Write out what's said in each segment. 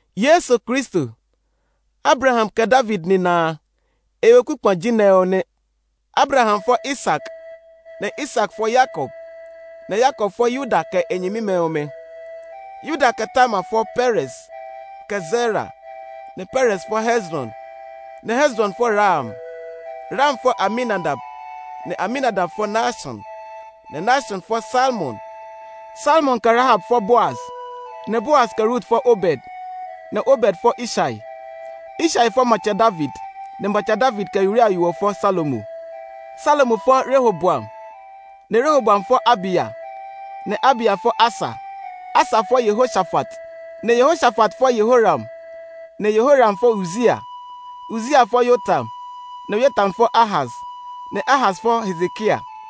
Yesu Kristo, Abraham kɛ David nina a, e weku kpa ji nɛ ɔ nɛ. Abraham fɔ Isak, nɛ Isak fɔ Yakob, nɛ Yakob fɔ Yuda kɛ e nyɛmimɛ ɔmɛ. Yuda kɛ Tamar fɔ Perez, kɛ Zera; nɛ Perez fɔ Hezron, nɛ Hezron fɔ Ram. Ram fɔ Aminadab, nɛ Aminadab fɔ Naashon, nɛ Naashon fɔ Salmon. Salmon kɛ Rahab fɔ Boaz, nɛ Boaz kɛ Rut fɔ Obed, nɛ Obed fɔ Ishai. Ishai fɔ Matsɛ David, nɛ Matsɛ David kɛ Uria yo ɔ fɔ Salomo. Salomo fɔ Rehoboam, nɛ Rehoboam fɔ Abiya, nɛ Abiya fɔ Asa. Asa fɔ Yehoshafat, nɛ Yehoshafat fɔ Yehoram, nɛ Yehoram fɔ Uzia. Uzia fɔ Yotam, nɛ Yotam fɔ Ahaz, nɛ Ahaz fɔ Hezekia.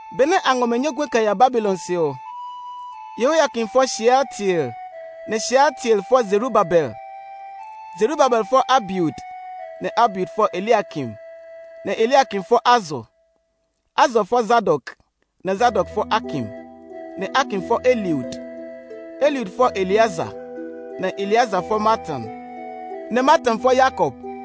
Benɛ a ngɔ mɛ nyɔguɛ kɛ ya Babilon se ɔ, Yehoyakin fɔ Shealtiel, nɛ Shealtiel fɔ Zerubabel. Zerubabel fɔ Abiud, nɛ Abiud fɔ Eliakim, nɛ Eliakim fɔ Azor. Azor fɔ Zadok, nɛ Zadok fɔ Akim, nɛ Akim fɔ Eliud. Eliud fɔ Eleazar, nɛ Eleazar fɔ Matan, nɛ Matan fɔ Yakob.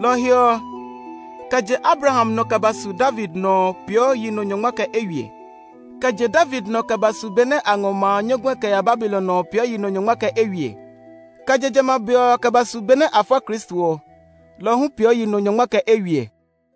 Lɔ ɔ he ɔ, kɛ je Abraham nɔ kɛ ba su David nɔ ɔ peeɔ yi nɔ nyɔngma kɛ eywiɛ. Kɛ je David nɔ kɛ ba su be nɛ a ngɔ ma a nyɔguɛ kɛ ya Babilon ɔ peeɔ yi nɔ nyɔngma kɛ eywiɛ. Kɛ je jamɛ a be ɔ kɛ ba su be nɛ a fɔ Kristo ɔ, lɔ ɔ hu peeɔ yi nɔ nyɔngma kɛ eywiɛ.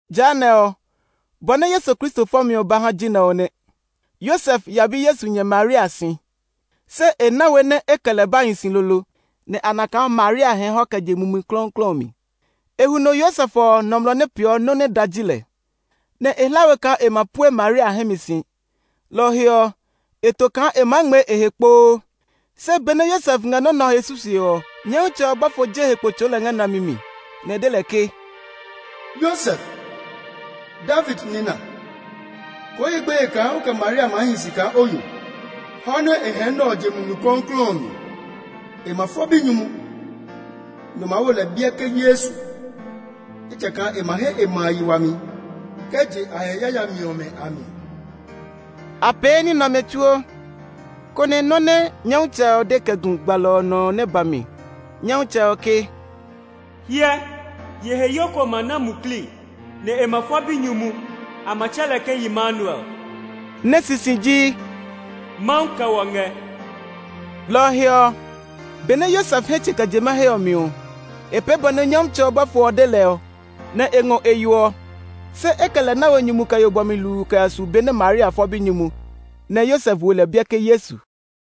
Jehanɛ ɔ, bɔ nɛ Yesu Kristo fɔmi ɔ ba ha ji nɛ ɔ nɛ. Yosef ya bi Yesu nyɛ Maria si, se e na we nɛ e kɛ lɛ ba hi si lolo nɛ a na kaa Maria hɛɛ hɔ kɛ je Mumi Klɔuklɔu ɔ mi. E huno Yosef ɔ, nɔmlɔ nɛ peeɔ nɔ́ nɛ da ji lɛ, nɛ e hla we kaa e ma pue Maria hɛ mi si. Lɔ ɔ he ɔ, e to kaa e maa ngmɛɛ e he kpoo. Se benɛ Yosef ngɛ nɔ́ nɛ ɔ he susue ɔ, Nyɔmtsɛ ɔ bɔfo je e he kpo tsɔɔ lɛ ngɛ nlami mi, nɛ e de lɛ ke, “Yosef, David nina, koo ye gbeye kaa o kɛ Maria maa hi si kaa o yo; hɔ nɛ e hɛɛ nɛ ɔ je Mumi Klɔuklɔu ɔ mi. E ma fɔ binyumu, nɛ o maa wo lɛ biɛ ke Yesu, ejakaa e ma he e ma a yi wami kɛ je a he yayami ɔmɛ a mi.” A pee ní nɛ ɔmɛ tsuo, konɛ nɔ́ nɛ Nyɔmtsɛ ɔ de kɛ gu gbalɔ ɔ nɔ ɔ nɛ ba mi. Nyɔmtsɛ ɔ ke, “Hyɛ, yiheyo ko ma na muklii, nɛ e ma fɔ binyumu; a ma tsɛ lɛ ke Yimanuel” nɛ sisi ji, “Mawu kɛ wɔ ngɛ.” Lɔ ɔ he ɔ, benɛ Yosef hɛ tsɛ̃ kɛ je mahe ɔ mi ɔ, e pee bɔ nɛ Nyɔmtsɛ ɔ bɔfo ɔ de lɛ ɔ, nɛ e ngɔ e yo ɔ. Se e kɛ lɛ na we nyumu kɛ yo bɔmi hluu kɛ ya su be nɛ Maria fɔ binyumu. Nɛ Yosef wo lɛ biɛ ke Yesu.